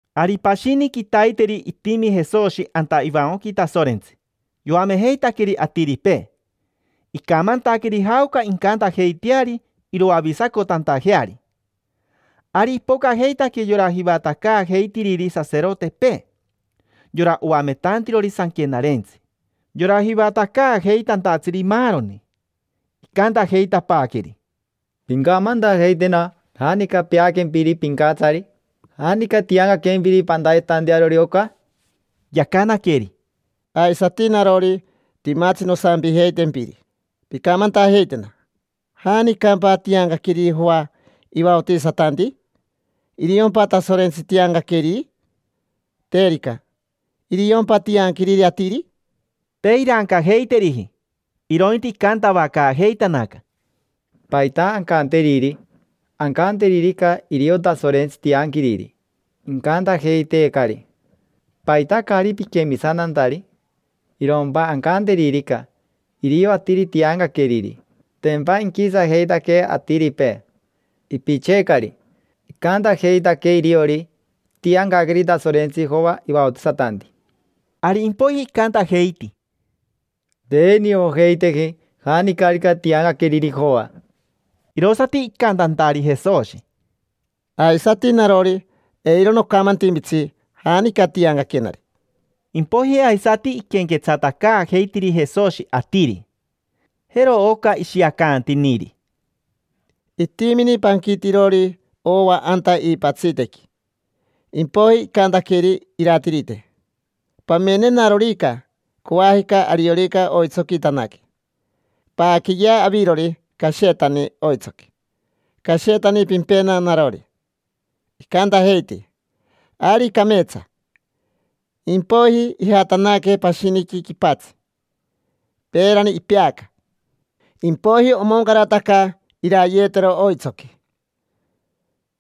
Ari pashini quitaiteri itimi Jesoshi anta ivancoqui Tasorentsi yoamejeitaqueri atiripee, icamantaqueri jaoca incantajeiteari iroavisacotantajeari. Ari ipocajeitaque yora jivatacaajeitiriri saserotepee, yora oametantirori sanquenarentsi, yora jivatacaajeitantatsiri, maaroni. Icantajeitapaaqueri: —Pincamantajeitena janica peaquempiri pincatsari: ¿janica tiancaquempiri pantayetantarori oca? Yacanaqueri: —Aisati narori, timatsi nosampijeitempiri. Pincamantajeitena: ¿janicampa tiancaqueriri Joa ivaotisatanti? ¿Iriompa Tasorentsi tiancaqueriri? Terica, ¿iriompa tianquiriri atiri? Te irancajeiteriji, irointi icantavacaajeitanaca: —¿Paita ancanteriri? Ancanteririca: “Irio Tasorentsi tianquiriri”, icantajeiteecari: “¿Paita caari piquemisantantari?” Irompa ancanteririca: “Irio atiri tiancaqueriri”, tempa inquisajeitaquee atiripee. Ipitseecari. Icantajeitaque iriori itiancaqueri Tasorentsi Joa ivaotisatanti. Ari impoiji icantajeiti: —Te niojeiteji janicarica tiancaqueriri Joa. Irosati icantantari Jesoshi: —Aisati narori, eiro nocamantimpitsi janica tiancaquenari. Impoiji aisati iquenquetsatacaajeitiri Jesoshi atiri, jero oca ishiacantiniri: —Itimini panquitirori ova anta iipatsitequi. Impoiji icantaqueri iratirite: “Pamenenarorica, coajica ariorica oitsoquitanaque, paaqueyea avirori cashetani oitsoqui, cashetani pimpena narori”. Icantajeiti: “Ari cameetsa”. Impoiji ijatanaque pashiniqui quipatsi, peerani ipeaca. Impoiji omoncarataca irayetero oitsoqui.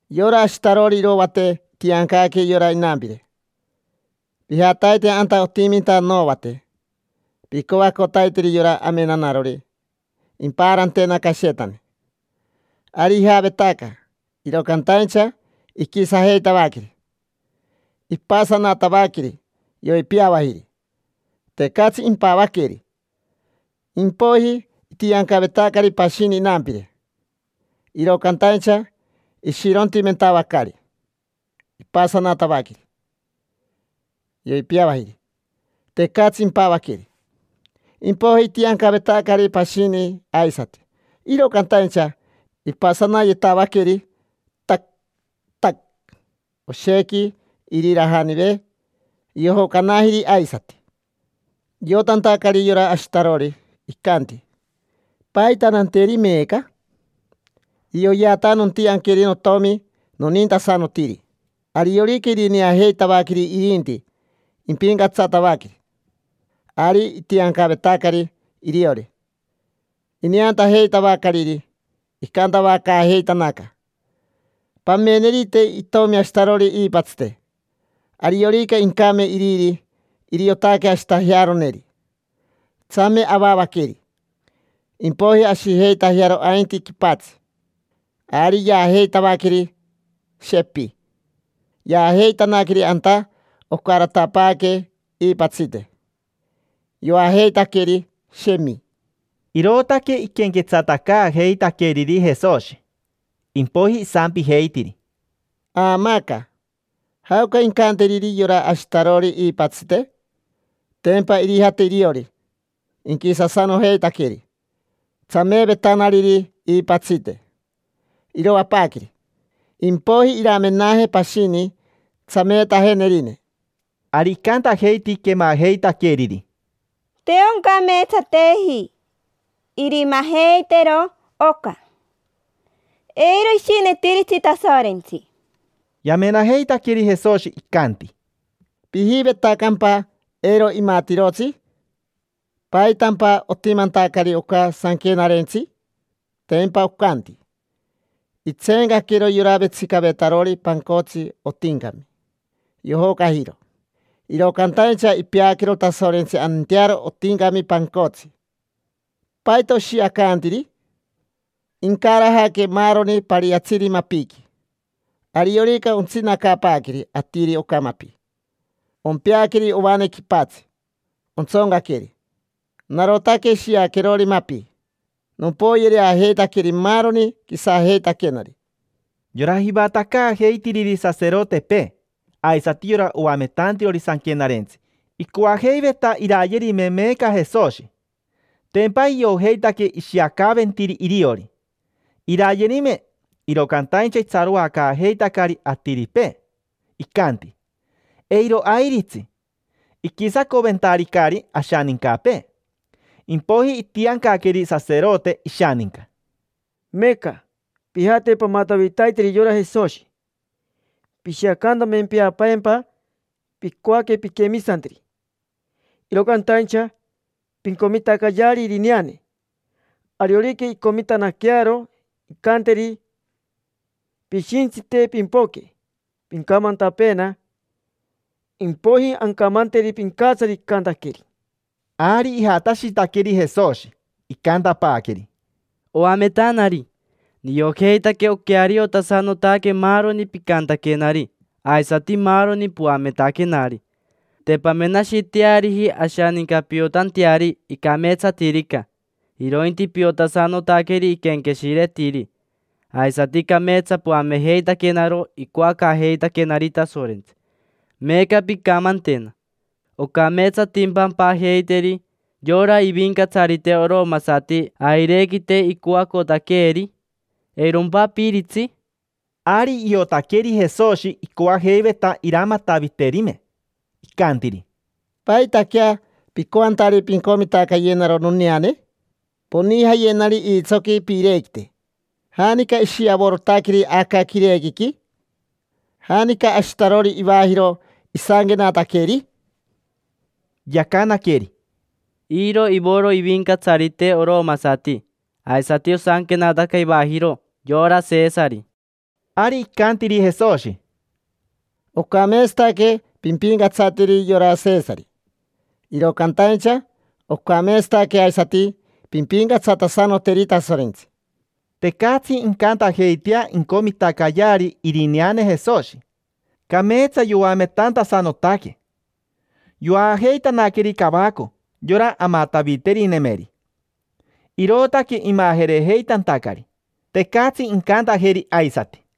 Yora ashitarori irovate itiancaque yora inampire: “Pijataite anta otiminta novate, picoacotaiteri yora amenanarori impaarantena cashetani”. Ari ijavetaca, iro cantaincha iquisajeitavaqueri, ipasanatavaqueri, yoipiavajiri. Tecatsi impavaqueri. Impoiji itiancavetacari pashini inampire, iro cantaincha ishirontimentavacari, ipasanatavaqueri, yoipiavajiri. Tecatsi impavaqueri. Impoiji itiancavetacari pashini aisati, iro cantaincha ipasanayetavaqueri, tac, tac, oshequi irirajanive. Yojocanajiri aisati. Iotantacari yora ashitarori, icanti: “¿Paita nanteri meeca? Irioyeata nontianqueri notomi nonintasanotiri. Ariorica irineajeitavaqueri irinti, impincatsatavaqueri”. Ari itiancavetacari iriori. Ineantajeitavacariri, icantavacaajeitanaca: “Pamenerite itomi ashitarori iipatsite. Ariorica incame iriri, iriotaque ashitajearoneri. Tsame avavaqueri, impoiji ashijeitajearo ainti quipatsi”. Ari yaajeitavaqueri, shepi. Yaajeitanaqueri anta ocaratapaaque iipatsite, yoajeitaqueri, shemi. Irootaque iquenquetsatacaajeitaqueriri Jesoshi. Impoiji isampijeitiri: —Aamaaca, ¿jaoca incanteriri yora ashitarori iipatsite? Tempa irijate iriori, inquisasanojeitaqueri tsameevetanariri iipatsite, iroapaaqueri. Impoiji iramenaje pashini tsameetajenerine. Ari icantajeiti quemajeitaqueriri: —Te oncameetsateji irimajeitero oca, eiro ishinetiritsi Tasorentsi. Yamenajeitaqueri Jesoshi, icanti: —¿Pijivetacampa eiro imatirotsi? ¿Paitampa otimantacari oca sanquenarentsi? Tempa ocanti: “Itseencaquero yora vetsicavetarori pancotsi otincami, yojocajiro. Iro cantaincha ipeaquero Tasorentsi antearo otincami pancotsi”. ¿Paita oshiacantiri? Incarajaque maaroni pariatsiri mapiqui, ariorica ontsinacapaaqueri atiri oca mapi, ompeaqueri ovane quipatsi, ontsoncaqueri. Narotaque shiaquerori mapi: nompoyereajeitaqueri maaroni quisajeitaquenari. Yora jivatacaajeitiriri saserotepee, aisati yora oametantirori Sanquenarentsi icoajeiveta irayerime meeca Jesoshi, tempa iojeitaque ishiacaventiri iriori. Irayerime, iro cantaincha itsaroacaajeitacari atiripee, icanti: “Eiro airitsi, iquisacoventaricari ashanincapee”. Impoiji itiancaqueri saserote ishaninca: —Meeca pijate pamatavitaiteri yora Jesoshi. Pishiacantamempeapeempa picoaque pinquemisanteri, iro cantaincha, pincomitacayeari irineane. Ariorica incomitanaquearo incanteri, pishintsite pimpoque pincamantapeena. Impoiji ancamanteri pincatsari icantaqueri. Ari ijatashitaqueri Jesoshi, icantapaaqueri: —Oametanari, niojeitaque oqueariotasanotaque maaroni picantaquenari aisati maaroni poametaquenari. Te pamenashiteariji ashaninca piotanteari icameetsatirica, irointi piotasanotaqueri iquenqueshiretiri. Aisati cameetsa poamejeitaquenaro icoacaajeitaquenari Tasorentsi. Meeca pincamantena: ¿ocameetsatimpa ampajeiteri yora ivincatsarite oromasati airequite icoacotaqueeri? ¿Eirompa apiritsi? Ari iotaqueri Jesoshi icoajeiveta iramataviterime. Icantiri: —¿Paitaquea picoantari pincomitacayenaro noneane? Poniajayenari iitsoqui piirequite. ¿Janica ishiavorotaqueri aca quirequiqui? ¿Janica ashitarori ivajiro isanquenataqueri? Yacanaqueri: —Iro ivoro ivincatsarite oromasati, aisati osanquenataca ivajiro: yora Sesari. Ari icantiri Jesoshi: —Ocameetsataque pimpincatsateri yora Sesari, iro cantaincha ocameetsataque aisati pimpincatsatasanoteri Tasorentsi. Tecatsi icantajeitea incomitacayeari irineane Jesoshi, cameetsa yoametantasanotaque. Yoajeitanaqueri cavaco yora amataviterinemeri, irootaque imajerejeitantacari. Tecatsi incantajeri aisati.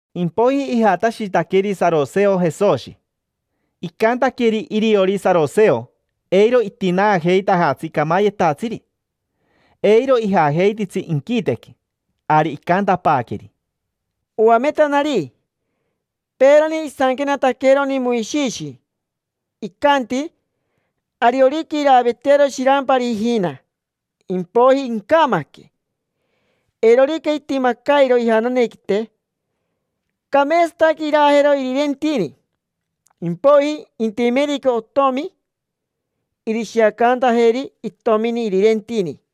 Impoiji ijatashitaqueri saroseo Jesoshi. Icantaque iriori saroseo eiro itinaajeitajatsi camayetatsiri, eiro ijajeititsi inquitequi. Ari icantapaaqueri: —Oametanari, peerani isanquenataqueroni Moishishi. Icanti ariorica iraavetearo shirampari ijina, impoiji incamaque. Eirorica itimacairo ijananequite, cameetsataque iraajero irirentini. Impoiji intimerica otomi irishiacantajeri itomini irirentini.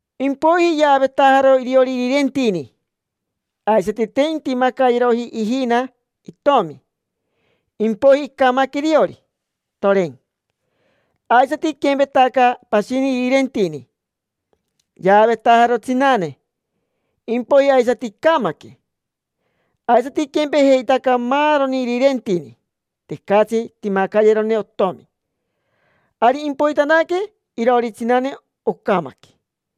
Impoiji yaavetajaro iriori irirentini. Aisati te intimacayeroji ijina itomi, impoiji icamaque iriori, toren. Aisati iquempetaca pashini irirentini. Yaavetajaro tsinane, impoiji aisati icamaque. Aisati iquempejeitaca maaroni irirentini. Tecatsi timacayerone otomi. Ari impoitanaque iroori tsinane, ocamaque.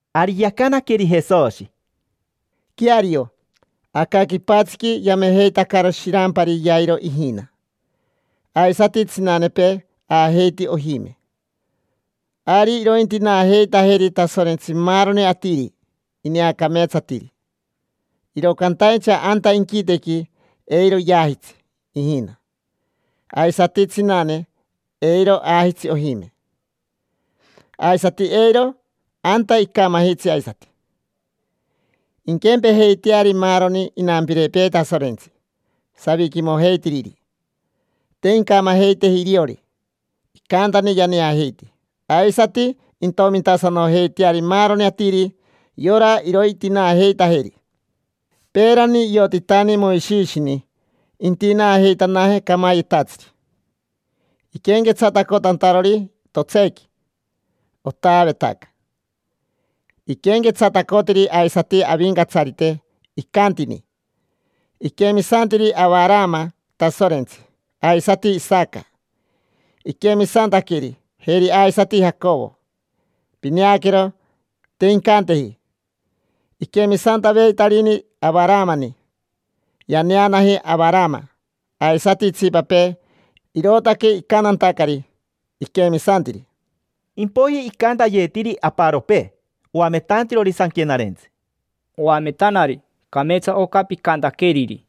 Ari yacanaqueri Jesoshi: —Queario, aca quipatsiqui yamejeitacaro shirampari yairo ijina. Aisati tsinanepee aajeiti ojime. Ari irointinaajeitajeri Tasorentsi maaroni atiri ineacameetsatiri, iro cantaincha anta inquitequi eiro yaajitsi ijina. Aisati tsinane, eiro aajitsi ojime. Aisati eiro anta icamajitsi aisati, inquempejeiteari maaroni inampirepee Tasorentsi, saviquimojeitiriri: te incamajeiteji iriori. Icantani yaneajeiti. Aisati intomintasanojeiteari maaroni atiri yora irointinaajeitajeri. Peerani iotitani Moishishini intinaajeitanaje camayetatsiri. Iquenquetsatacotantarori totseequi otaavetaca, iquenquetsatacotiri aisati Avincatsarite. Icantini: “Iquemisantiri Avarama Tasorentsi. Aisati Isaca iquemisantaqueri, jeri aisati Jacovo”. Pineaquero, te incanteji: “Iquemisantaveitarini Avaramani”. Yaneanaji Avarama aisati itsipapee, irootaque icantantacari: “Iquemisantiri”. Impoiji icantayetiri aparopee oametantirori sanquenarentsi: —Oametanari, cameetsa oca picantaqueriri.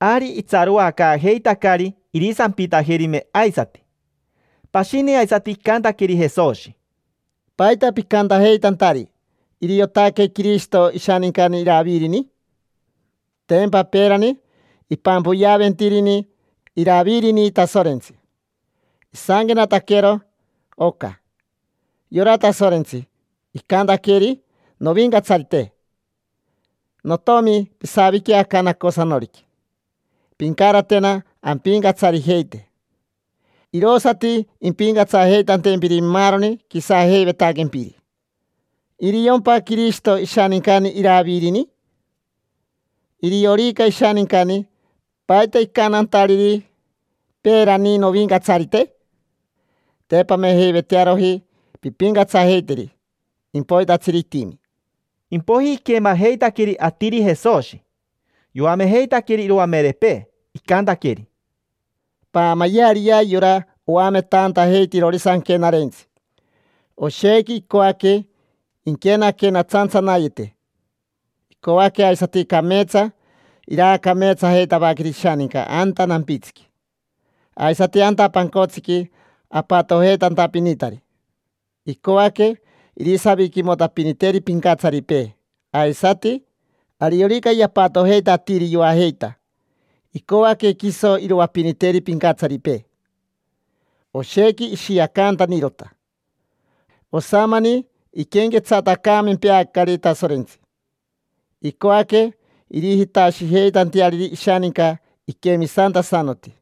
Ari itsaroacaajeitacari irisampitajerime aisati. Pashini aisati icantaqueri Jesoshi: —¿Paita picantajeitantari: “Iriotaque Quirishito ishanincani Iravirini”? Tempa peerani ipampoyeaventirini Iravirini Tasorentsi, isanquenataquero oca: “Yora Tasorentsi, icantaqueri novincatsarite: ‘Notomi, pisavique aca nacosanoriqui, pincaratena ampicatsarijeite, irosati impincatsajeitantempiri maaroni quisajeivetaquempiri’”. ¿Iriompa Quirishito ishanincani Iravirini? Iriorica ishanincani, ¿paita icantantariri peerani: “Novincatsarite”? Te pamejeivetearoji pimpincatsajeiteri impoitatsiri itimi. Impoiji iquemajeitaqueri atiri Jesoshi, yoamejeitaqueri iroamerepee, icantaqueri: —Paamayeariyea yora oametantajeitirori sanquenarentsi. Oshequi icoaque inquenaquenatsantsanayete. Icoaque aisati cameetsa iraacameetsajeitavaqueri ishaninca anta nampitsiqui. Aisati anta pancotsiqui apatojeitantapinitari, icoaque irisaviquimotapiniteri pincatsaripee. Aisati ariorica yampatojeita atiri yoajeita, icoaque quiso iroapiniteri pincatsaripee. Oshequi ishiacantanirota. Osamani iquenquetsatacaamempeacari Tasorentsi. Icoaque irijitashijeitanteariri ishaninca iquemisantasanoti.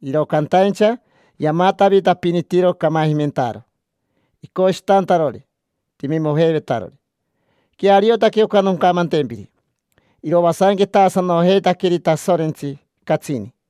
Iro cantaincha yamatavitapinitiro camajimentaaro, icoshitantarori timimojeivetarori. Queariotaque oca noncamantempiri: iroasanquetaasanojeitaqueri Tasorentsi, catsini.